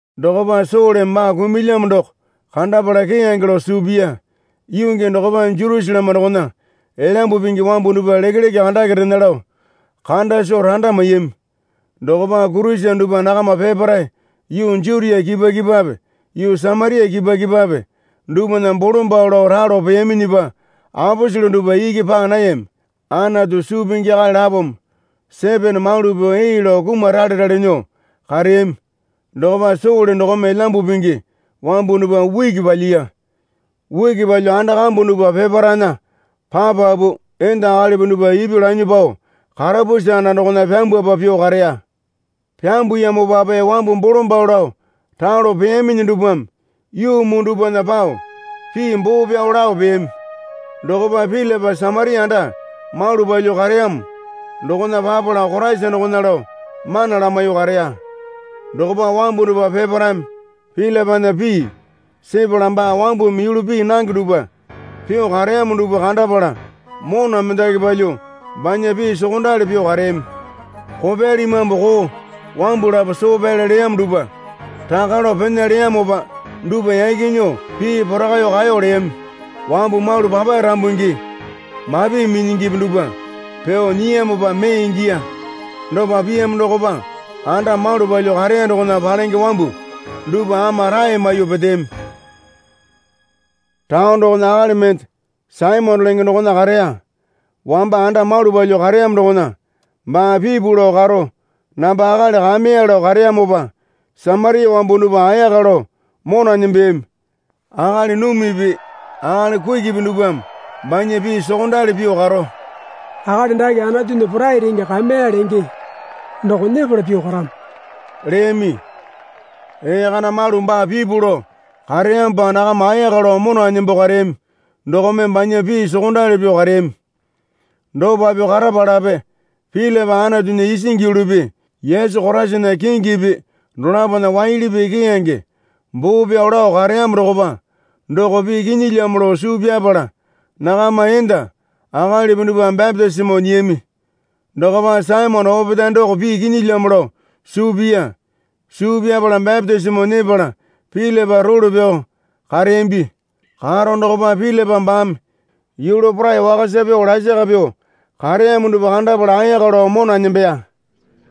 Dokopa Soleme baa kumulyamo doko kandapala keyange lao suu piya. Yuu gii dokopa Jerusaleme dokona Elyambu Pingi wambu dupwa lekeleke andake rena lao kanda soo randa maiyami. Dokopa Kurisene dupwa nakama peparae yuu Jutia kipwa kipwape yuu Samaria kipwa kipwape dupwana bolombalo lao ralo peyaminyipa aposele dupwa iki paa nayami. Anatu suu pingi akali lapome Sitipena malu pyuo ee lao kumaralerale nyuo kareyami. Dokopa Sole dokome Elyambu Pingi wambu dupwa uki palyiya. Uki palyuo anda kambu dupwa peparaena papapu enda akalipi dupwa ipyuo lanyuo pao karapusi anda dokona pyambwapa pyuo kareya. Pyambuyamopape wambu bolombalo lao ralo peyaminyi dupwame yuu muu dupwana pao pii boo pyao lao peyami. Dokopa Pilipa Samaria anda malu palyuo kareyamo dokona papala Koraisa dokona lao mana lamaiyuo kareya. Dokopa wambu dupwa peparaeme Pilipana pii sepala baa wambumi yulu pii nange dupwa pyuo kareyamo dupwa kandapala mona mendaki palyuo banya pii sokondali pyuo kareyami. Kopyali imambu koo wambu lapo soo pyale leyamo dupwa raka lao pena leyamopa dupwa yaki nyuo pii porakaiyuo kaeyo leyami. Wambu malu papae rambungi mapi minyingipi dupwa pyuo nyiyamopa mee ingiya. Dopa piyamo dokopa anda malu palyuo kareya dokona palenge wambu dupwa ama rae maiyuo peteyami. Taone dokona akali mende Saimone lenge dokona kareya. Wamba anda malu palyuo kareyamo dokona baa pipu lao karo namba akali kameya lao kareyamopa Samaria wambu dupwa ayaka lao mona nembeyami. Akali numipi akali kukipi dupwame banya pii sokondali pyuo karo, Akali dake Anatunya Porai Renge Kameya lenge doko nyepala pyuo karamo, leyami. Ee kana malu baa pipu lao kareyamopa nakama ayaka lao mona nembo kareyami dokome banya pii sokondali pyuo kareyami. Dopa pyuo karapalape Pilipa Anatunya isingi yulupi Yesu Koraisana kingipi dolapona waili pii keyange boo pyao lao kareyamo dokopa doko pii kinyilyamo lao suu pyapala nakama enda akalipi dupwa bapitisimo nyiyami. Dokopa Saimone opetae doko pii kinyilyamo lao suu piya. Suu pyapala bapitisimo nyepala Pilipa role pyao kareyambi. Karo dokopa Pilipa baame yulu porai wakasa pyuo lasaka pyuo kareyamo dupwa kandapala ayaka lao mona nembeya.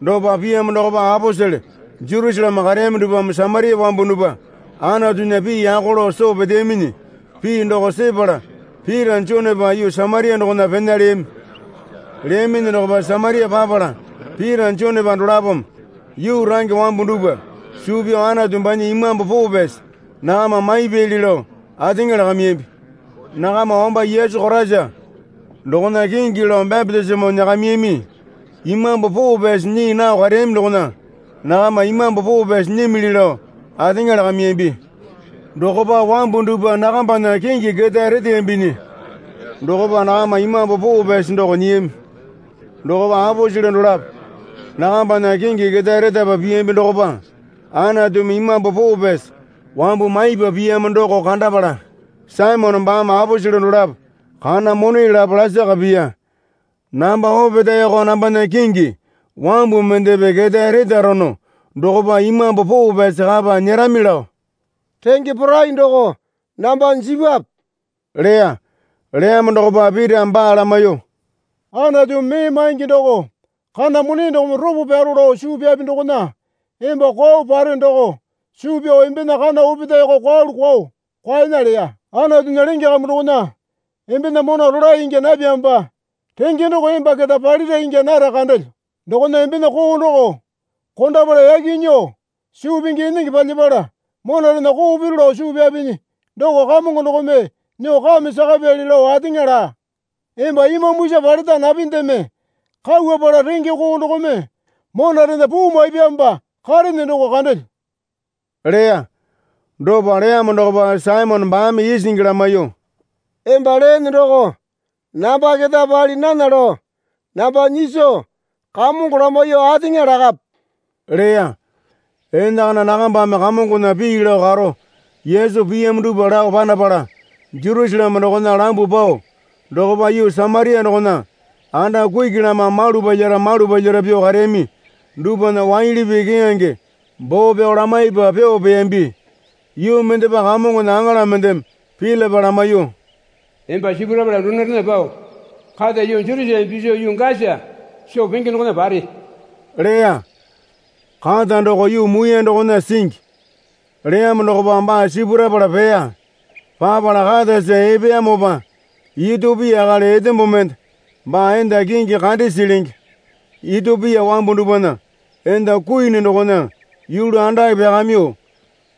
Dopa piyamo dokopa aposele Jerusaleme kareyami dupwame Samaria wambu dupwa Anatunya pii yako lao soo peteyaminyi pii doko sepala Pita Jonepa yuu Samaria dokona pena leyami. Leyaminyi dokopa Samaria papala Pita Jonepa dolapome yuu range wambu dupwa suu pyao Anatu banya Imambu Poo Pyasi nakama maipyali lao ateŋa lakayambi. Nakama wamba Yesu Koraisa dokona kingi lao bapitisimo nyakamiyami. Imambu Poo Pyasi nyii nao kareyami dokona nakama Imambu Poo Pyasi nyimili lao ateŋa lakamiyambi. Dokopa wambu dupwa nakambana kingi ketae reteyambinyi dokopa nakama Imambu Poo Pyasi doko nyiyami. Dokopa aposele dolapo nakambana kingi ketae retapa piyambi dokopa Anatumi Imambu Poo Pyasi wambu maipa piyamo doko kandapala Saimone baame aposele dolapo kana mone lapo lasaka piya. Namba opetaeko nambana kingi wambu mendepe ketae retarono dokopa Imambu Poo Pyasi kapa nyerami lao renge porai doko namba jipwape, leya. Leyamo dokopa Pitame baa lamaiyuo, Anatumi mee maingi doko kana mone dokome ropo pyaro lao suu pyapi dokona emba kwao pare doko suu pyao embena kana opetaeko kwaelu kwaeyo kwaena leya. Anatunya lenge kambu dokona embena mona rolae ingya napyamopa renge doko emba keta palira ingya nara kandelyo. Dokona embena koo doko kondapala yaki nyuo suu pingi enenge palyapala monarena koo piru lao suu pyapinyi doko Kamongo dokome nyuo kame sakapyali lao ateŋa laa. Emba imambusa paleta napindeme kauwapala renge koo dokome monarena puu maipyamopa karene doko kandelyo leya. Dopa leyamo dokopa Saimone baame isingi lamaiyuo, Emba leene doko namba keta pali nana lao namba nyiso Kamongo lamaiyuo ateŋa lakape leya. Enakana nakambame Kamongona pii lao karo Yesu piyamo dupwa lao panapala Jerusaleme dokona lambuo pao dokopa yuu Samaria dokona anda kuki lama malu palyara malu palyara pyuo kareyami dupwana waili pii keyange boo pyao lamaipa pyuo peyambi. Yuu mendepa Kamongona aŋala mendeme Pilipa lamaiyuo, Emba sipurapala donorena pao kata yuu Jerusaleme piso yuu Gasa soo penge dokona pare leya. Kata doko yuu muiyane dokona singi. Leyamo dokopa baa sipurapala peya. Papala katasa epeyamopa Itiopia akali etombo mende baa enda kingi Kandesi lenge Itiopia wambu dupwana enda kuini dokona yulu andake pyakamyuo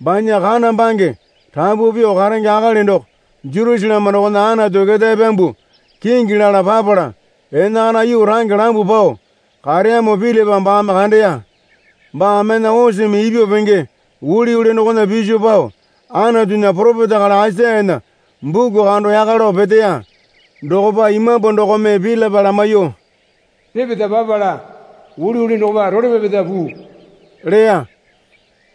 banya kana bange rapu pyuo karenge akali doko Jerusaleme dokona Anatu ketae pyambuo kingi lala papala enakana yuu range lambuo pao kareyamo Pilipa baame kandeya. Baa mena oseme ipyuo penge uliuli dokona piso pao Anatunya poropeta akali Aisayana buku kando yaka lao peteya. Dokopa Imambu dokome Pilipa lamaiyuo, Repeta papala uliuli dokopa role pyapeta puu leya.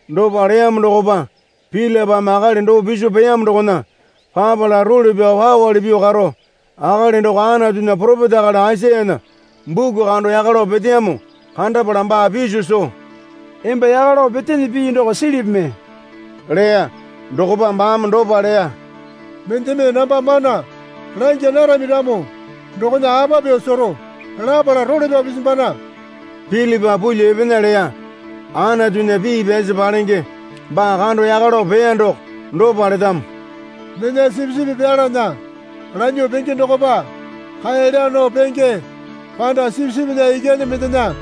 Dopa leyamo dokopa Pilipame akali doo piso peyamo dokona papala role pyao pawali pyuo karo akali doko Anatunya poropeta akali Aisayana buku kando yaka lao peteyamo kandapala baa piso soo, Emba yaka lao petene pii doko silipi mee? leya. Dokopa baame dopa leya. Mendeme namba mana langya narami ramo dokona apa pyuo sero? lapala, Role pyao pisimbana. Pilipa pulyuo epena leya. Anatunya pii pyasi palenge baa kando yaka lao peya doko dopa letamo. Mena sipisipi pyalana lanyuo penge dokopa kae laa nao penge, panda sipisipinya ikyane mendena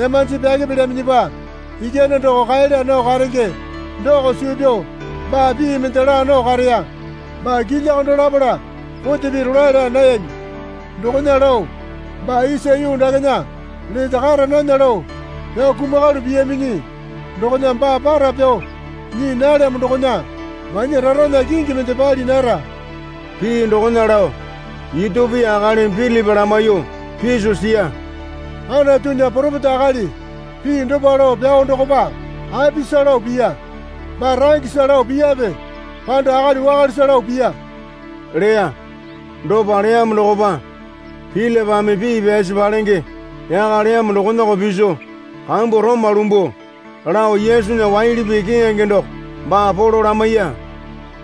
emanji pyake pilyaminyipa ikyane doko kae laa nao karenge doko suu pyao baa pii mende laa nao kareya. Baa kilya kando lapala kote pii rolae laa nayami. Dokona lao baa isa yuu dakena lete kara nana lao pyao kumakalu piyaminyi dokona baa para pyao nyii nalyamo dokona banya rarana kingi mende pali nara. Pii dokona lao Itiopia akalimi Pilipa lamaiyuo piso siya. Anatunya poropeta akali pii dopa lao pyao dokopa apisa lao piya? Baa rangesa lao piyape panda akali wakalesa lao piya? leya. Dopa leyamo dokopa Pilipame pii pyasi palenge yaka leyamo dokonako piso kambu roma lumbuo lao Yesunya waili pii keyange doko baa polo lamaiya.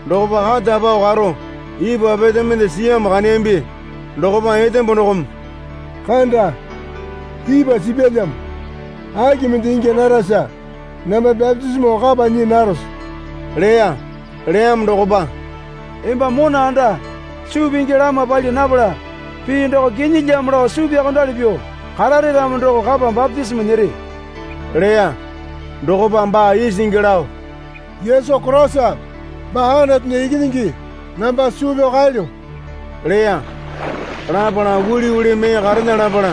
Dokopa kata pao karo ipwa pete mende siyamo kandeyambi. Dokopa etembo dokome, Kanda, ipwa sipyalyamo. Aki mende ingya narasa namba bapitisimo kapa nyii narose? leya. Leyamo dokopa, Emba mona anda suu pingi lama pali napala pii doko kinyilyamo lao suu pyaokondali pyuo karare ramo doko kapa bapitisimo nyere leya. Dokopa baa isingi lao, Yesu Koraisa baa Anatunya Ikinyingi namba suu pyao kaelyo leya. Lapala uliuli mee karena lapala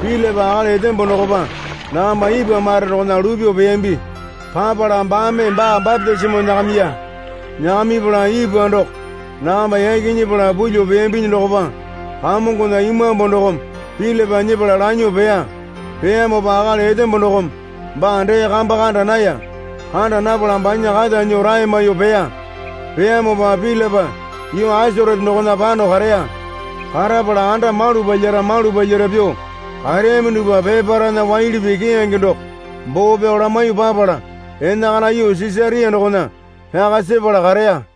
Pilipa akali etembo dokopa nakamba ipwa mare dokona lupyuo peyambi. Papala baame baa bapitisimo nyakamiya. Nyakamipala ipwa doko nakamba yaki nyepala pulyuo peyambinyi dokopa Kamongona Imambu dokome Pilipa nyepala lanyuo peya. Peyamopa akali etembo dokome baa dee kamba kanda naya. Kanda napala banya kata nyuo rae maiyuo peya. Peyamopa Pilipa yuu Asarote dokona pano kareya. Karapala anda malu palyara malu palyara pyuo kareyami dupwa peparaena waili pii keyange doko boo pyao lamaiyuo papala enakana yuu Sisaria dokona pyaka sepala kareya.